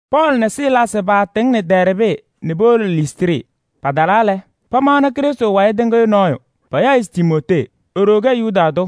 Pɔɔlɩ nɛ Silaasɩ paatɩŋnɩ Dɛɛrbɩ nɛ powolo Listrɩ. Patalaa lɛ, pamaɣnɩ Krɩstʋ wayɩ tɩŋɩyʋ nɔɔyʋ, payaɣ-ɩ se Timootee. E-ɖoo kɛ Yuda tʋ,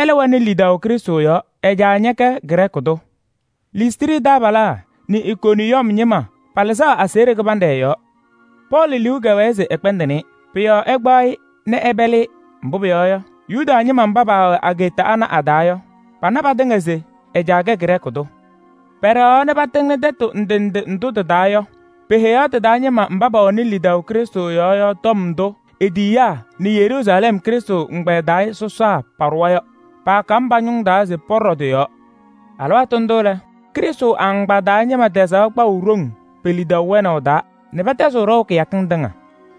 ɛlɛ wɛnɩ lidaʋ Krɩstʋ yɔɔ. Ɛ-caa ñɛkɛ Grɛɛkɩ tʋ. Listrɩ taabalaa nɛ Ikoniyɔm ñɩma palɩzaɣ aseɣɖe kɩbanɖɛ ɛ-yɔɔ. Pɔɔlɩ liu kɛwɛɛ se ɛkpɛndɩnɩ-ɩ. Pʋ-yɔɔ ɛkpaɣ-ɩ nɛ ɛpɛlɩ-ɩ, mbʋ pʋyɔɔ yɔ, Yuda ñɩma mba paawɛ ageeta ana a-taa yɔ, pana patɩŋa se ɛ-caa kɛ Grɛɛkɩ tʋ. Pɛɖɛɣaɣ nɛ patɩŋnɩ tɛtʋ ndʋ ndʋ tɩ-taa yɔ, peheyaɣ tɩ-taa ñɩma mba pɛwɛnɩ lidaʋ Krɩstʋ yɔɔ yɔ tɔm ndʋ e-tiyiyaa nɛ Yeruusalɛm Krɩstʋ ɛgbɛyɛ taa sɔsaa paaɖʋwa yɔ. Paakam pa-ñʋŋ taa se pɔɖɔ tɩ-yɔɔ. Alɩwaatʋ ndʋ lɛ, Krɩstʋ agbaa taa ñɩma tɛzaɣ kpaʋ ɖoŋ pe-lidaʋ wɛnaʋ taa nɛ pɛtɛzɩɣ ɖɔʋ kɩyakɩŋ tɩŋa.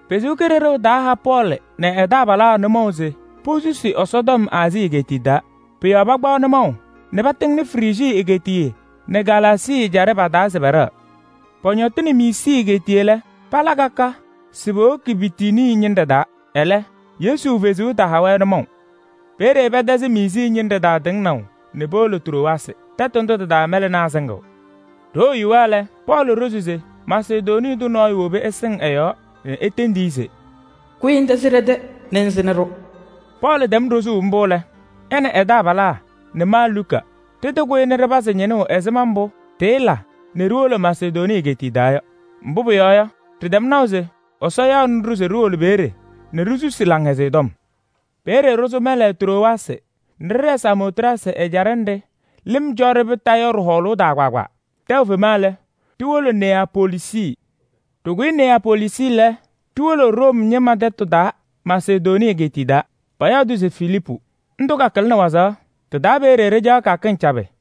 Ɛsɔ Kalɩzaɣ taaha Pɔɔlɩ nɛ ɛ-taabalaa nʋmɔʋ se posusi Ɛsɔtɔm Aazii egeetiye taa. Pʋ-yɔɔ pakpaɣ nʋmɔʋ nɛ patɩŋnɩ Frijii egeetiye nɛ Galaasii ɛjaɖɛ pa-taa se pɛɖɛɣ. Pɔñɔtɩnɩ Miisii egeetiye lɛ, pala ka ka se powoki Bitinii ñɩnɖɛ taa, ɛlɛ, Yesu Kalɩzaɣ taha-wɛ nʋmɔʋ. Peeye pɛtɛzɩ Miisii ñɩnɖɛ taa tɩŋnaʋ nɛ powolo Trowaasɩ. Tɛtʋ ndʋ tɩ-taa mɛlɛnaa sɩŋɩɣ. Ɖoo yuwa lɛ, Pɔɔlɩ ɖozi se Masedonii tʋ nɔɔyʋ wobi ɛsɩŋ ɛ-yɔɔ nɛ etendi-i se: “Kʋyɩ ŋtɛzɩ ɖɛ-tɛ nɛ ŋsɩnɩ-ɖʋ.” Pɔɔlɩ tɛm ɖozuu mbʋ lɛ, ɛ nɛ ɛ-taabalaa nɛ ma Luka ɖɩtɩkʋyɩ nɛ ɖɩpazɩ ñɩnʋʋ ɛzɩma mbʋ ɖɩɩla nɛ ɖiwolo Masedonii egeetiye taa yɔ. Mbʋ pʋyɔɔ yɔ, ɖɩtɛm naʋ se Ɛsɔ yaɣnɩ-ɖʋ se ɖiwolo peeye nɛ ɖisusi Laŋhɛzɩyɛ Tɔm. Peeye ɖɩsʋ mɛlɛ Trowaasɩ nɛ ɖɩɖɛɛ Samootrasɩ ɛjaɖɛ nɖɩ lɩm cɔ-ɖɩ kondiko yɔ ɖɩ-hɔɔlʋʋ taa kpaagbaa. Tɛʋ fema lɛ, ɖiwolo Neyapoliisi. Ɖɩkʋyɩ Neyapoliisi lɛ, ɖiwolo Room ñɩma tɛtʋ taa Masedonii egeetiye taa, payaɣ-tʋ se Filiipu. Ndʋ kakɩlɩnɩ wazaɣ. Tɩ-taa peeye ɖɩcaɣ kɩyakɩŋ cabɩ.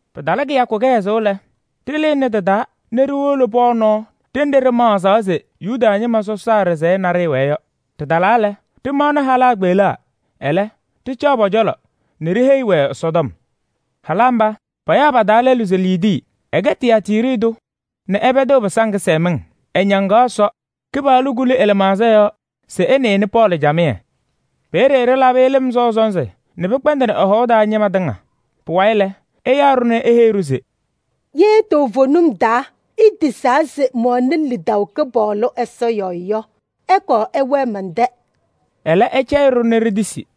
Pɩtalɩ kɩyakʋ kɩhɛzʋʋ lɛ, ɖɩlɩnɩ tɩ-taa nɛ ɖiwolo pɔɔ nɔɔ ɖenɖe ɖɩmaɣzaɣ se Yuda ñɩma Ɛsɔ ɖɩsɛyɛ naɖɩyɛ wɛɛ yɔ. Ɖɩtalaa lɛ, ɖɩmaɣnɩ halaa kpeɣlaa, ɛlɛ ɖɩcaɣ pɔ-cɔlɔ nɛ ɖiheyiɣ-wɛ Ɛsɔtɔm. Halaa mba, payaɣ pa-taa lɛlʋ se Liidii, ɛkɛ Tiyaatiiri tʋ nɛ ɛpɛdɩɣ pɩsaŋ kɩsɛmɩŋ. Ɛñaŋaɣ Ɛsɔ, Kɩpaɣlʋ kuli ɛ-lɩmaɣza yɔɔ se ɛnɩnɩ Pɔɔlɩ camɩyɛ. Peeye ɖɩlabɩ-ɩ lɩm sɔʋ sɔnzɩ nɛ pɩkpɛndɩnɩ ɛ-hɔʋ taa ñɩma tɩŋa. Pʋwayɩ lɛ, ɛyaa-ɖʋ nɛ eheyi-ɖʋ se: “Ye toovenim taa itisaa se mɛwɛnɩ lidaʋ Kɩpaɣlʋ Ɛsɔ yɔɔ yɔ, ɩkɔɔ ɩwɛɛ mɛn-tɛ.” Ɛlɛ ɛcɛyɩ-ɖʋ nɛ ɖitisi.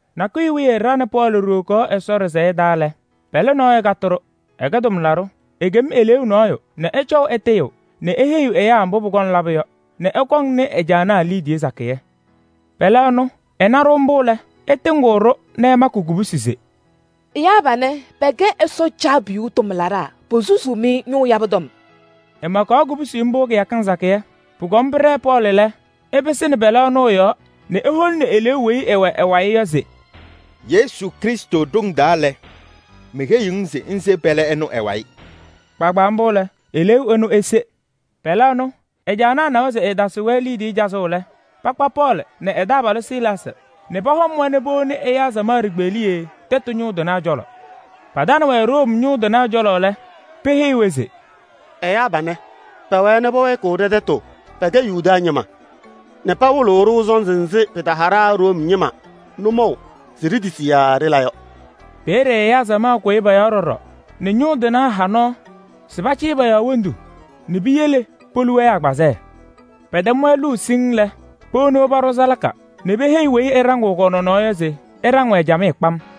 Nakʋyʋ wiye ɖa nɛ Pɔɔlɩ ɖiwokaɣ Ɛsɔ ɖɩsɛyɛ taa lɛ, pɛlɛ nɔɔyʋ katɩ-ɖʋ, ɛkɛ tʋmlaɖʋ. Ekem eleeu nɔɔyʋ nɛ ɛcɔʋ ɛtɩyɩɣ nɛ eheyiɣ ɛyaa mbʋ pʋkɔŋ labʋ yɔ nɛ ɛkɔŋnɩ ɛ-caanaa liidiye sakɩyɛ. Pɛlɛ ɛnʋ, ɛna-ɖʋ mbʋ lɛ, ɛtɩŋɩɣ-ɖʋ nɛ ɛmakɩ kubusi se: “Ɛyaa panɛ pɛkɛ Ɛsɔ Caabiyuu tʋmlaɖaa, posusuu-mɩ ñʋʋ yabʋ tɔm.” Ɛmakaɣ kubusi mbʋ kɩyakɩŋ sakɩyɛ. Pʋkɔm pɩɖɛɛ Pɔɔlɩ lɛ, ɛpɩsɩnɩ pɛlɛ ɛnʋ ɛ-yɔɔ nɛ eholini eleeu weyi ɛwɛ ɛ-wayɩ yɔ se: “Yesu Krɩstʋ ɖoŋ taa lɛ, meheyiɣ-ŋ se ŋse pɛlɛ ɛnʋ ɛ-wayɩ!” Kpaagbaa mbʋ lɛ, eleeu ɛnʋ ese. Pɛlɛ ɛnʋ ɛ-caanaa nawa se ɛɛtasɩɣ-wɛ liidiye cazʋʋ lɛ, pakpa Pɔɔlɩ nɛ ɛ-taabalʋ Silaasɩ nɛ pɔhɔm-wɛ nɛ powoni ɛyaa samaɣ ɖikpeɣliye tɛtʋ ñʋŋ tɩnaa cɔlɔ. Patanɩ-wɛ Room ñʋŋ tɩnaa cɔlɔ lɛ, peheyi-wɛ se: “Ɛyaa panɛ, pɛwɛɛ nɛ pɛwɛɛkɩɣ ɖɛ-tɛtʋ. Pɛkɛ Yuda ñɩma nɛ pawɩlɩɣ-ɖʋ sɔnzɩ nzɩ pɩtaha ɖa Room ñɩma nʋmɔʋ se ɖitisi yaa ɖɩla yɔ.” Peeye ɛyaa samaɣ kʋyɩ pɔ-yɔɔ ɖɔɖɔ nɛ ñʋŋ tɩnaa ha nɔɔ se pacɩyɩ pɔ-yɔɔ wondu nɛ piyele polu-wɛ agbazɛɛ. Pɛtɛm-wɛ luu siŋŋ lɛ, powoni-wɛ paɖʋ salaka nɛ peheyi weyi ɛɖaŋɩɣ kɔ-nɔnɔɔ yɔ se ɛɖaŋ-wɛ camɩyɛ kpam.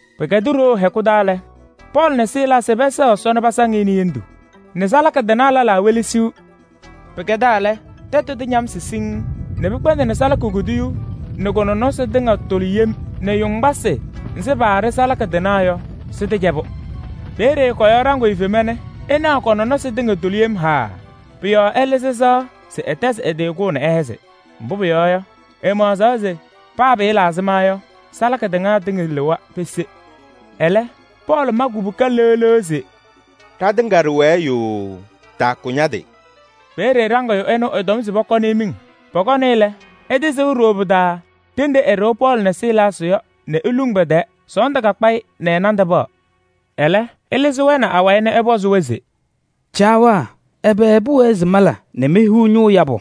Pɩkɛdɩ ɖoo hɛkʋ taa lɛ, Pɔɔlɩ nɛ Silaasɩ pɛsɛɣ Ɛsɔ nɛ pasaŋ-ɩ nɛ hendu nɛ salaka tɩnaa lɛlaa welesiɣ. Pɩkɛdaa lɛ, tɛtʋ tɩñamsɩ siŋŋ nɛ pɩkpɛndɩnɩ salaka kuduyuu nɛ kʋ-nɔnɔsɩ tɩŋa tɩtʋlɩ yem nɛ yoŋgbasɩ nzɩ paaɖɩ salaka tɩnaa tɩŋa yɔ sɩtɩcɛbʋ. Peeye kɔ-yɔɔ ɖaŋɩyʋ fema nɛ ɛnaɣ kɔ-nɔnɔsɩ tɩŋa tʋlɩ yem haaa. Pʋ-yɔɔ ɛlɩzɩ ɛ-sɩɣa se ɛtɛzɩɣ ɛ-tɩ kʋʋ nɛ ɛhɛzɩ. Mbʋ pʋyɔɔ yɔ, ɛmaɣzaɣ se paa pɩɩla ɛzɩma yɔ, salaka tɩnaa tɩŋa lɩwa pese. Ɛlɛ, Pɔɔlɩ ma kubuka leɣ leɣ se: “Ɖatɩŋa ɖɩwɛɛ yooo, taakʋ ña-tɩ!” Peeye ɖaŋɩyʋ ɛnʋ ɛtɔm se pɔkɔnɩ-ɩ miŋ. Pɔkɔnɩ-ɩ lɛ, ɛtɩsʋʋ ɖooo pɩ-taa ɖenɖe ɛɖɩɣ Pɔɔlɩ nɛ Silaasɩ yɔ nɛ eluŋ pɛ-tɛɛ. Sɔɔndʋ kakpa-ɩ nɛ ɛ-nandʋ paɣ. Ɛlɛ ɛlɩzɩ-wɛ nɛ awayɩ nɛ ɛpɔzɩ-wɛ se: “Caawaa! Ɛbɛ pʋwɛɛ se mala nɛ mehiɣ ñʋʋ yabʋ?”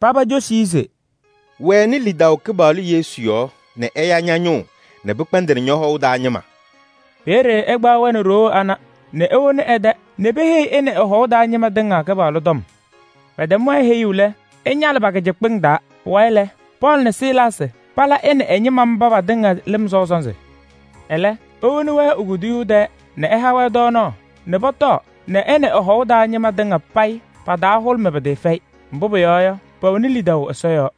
Paba cosi-i se: “Wɛnɩ lidaʋ Kɩpaɣlʋ Yesu yɔɔ nɛ ɛya ña-ñʋʋ nɛ pɩkpɛndɩnɩ ñɔ-hɔʋ taa ñɩma.” Peeye ɛkpaɣ-wɛ nɛ ɖoo ana nɛ ewoni ɛ-tɛ nɛ peheyi ɛ nɛ ɛ-hɔʋ taa ñɩma tɩŋa Kɩpaɣlʋ tɔm. Pɛtɛm-wɛ heyuu lɛ, ɛñalɩ pa-kɩcɩkpɩŋ taa. Pʋwayɩ lɛ, Pɔɔlɩ nɛ Silaasɩ pala ɛ nɛ ɛ-ñɩma mba patɩŋa lɩm sɔʋ sɔnzɩ. Ɛlɛ ewoni-wɛ e-kuduyuu tɛɛ nɛ ɛha-wɛ tɔɔnaɣ nɛ pɔtɔɔ nɛ ɛ nɛ ɛ-hɔʋ taa ñɩma tɩŋa payɩ pa-taa hʋlʋmɩ pɩtɩɩfɛyɩ, mbʋ pʋyɔɔ yɔ, pɛwɛnɩ lidaʋ Ɛsɔ yɔɔ.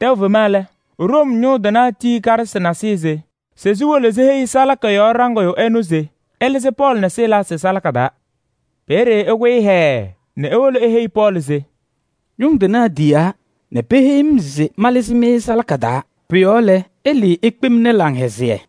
Tɛʋ fema lɛ, Room ñʋŋ tɩnaa tiyi karɩsɩ nasɩyɩ se siwolo siheyi salaka yɔɔ ɖaŋɩyʋ ɛnʋ se ɛlɩzɩ Pɔɔlɩ nɛ Silaasɩ salaka taa. Peeye ɛkʋyɩ hɛɛɛ nɛ ewolo eheyi Pɔɔlɩ se: “Ñʋŋ tɩnaa tiyaa nɛ peheyi-m se malɩzɩ-mɩ salaka taa. Pʋ-yɔɔ lɛ, ɩlɩɩ ikpemni laŋhɛzɩyɛ.”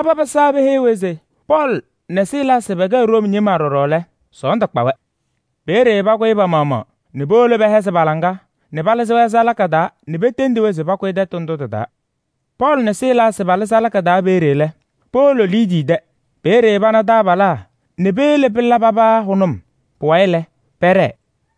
Paba pɩsaa peheyi-wɛ se Pɔɔlɩ nɛ Silaasɩ pɛkɛ Room ñɩma ɖɔɖɔ lɛ, sɔɔndʋ kpa-wɛ. Peeye pakʋyɩ pa-maɣmaɣ nɛ powolo pɛhɛzɩ pa-laŋa nɛ palɩzɩ-wɛ salaka taa nɛ petendi-wɛ se pakʋyɩ tɛtʋ ndʋ tɩ-taa. Pɔɔlɩ nɛ Silaasɩ palɩ salaka taa peeye lɛ, powolo Liidii tɛ. Peeye pana taabalaa nɛ peyele pɩla paba hʋnʋm. Pʋwayɩ lɛ, pɛɖɛɛ.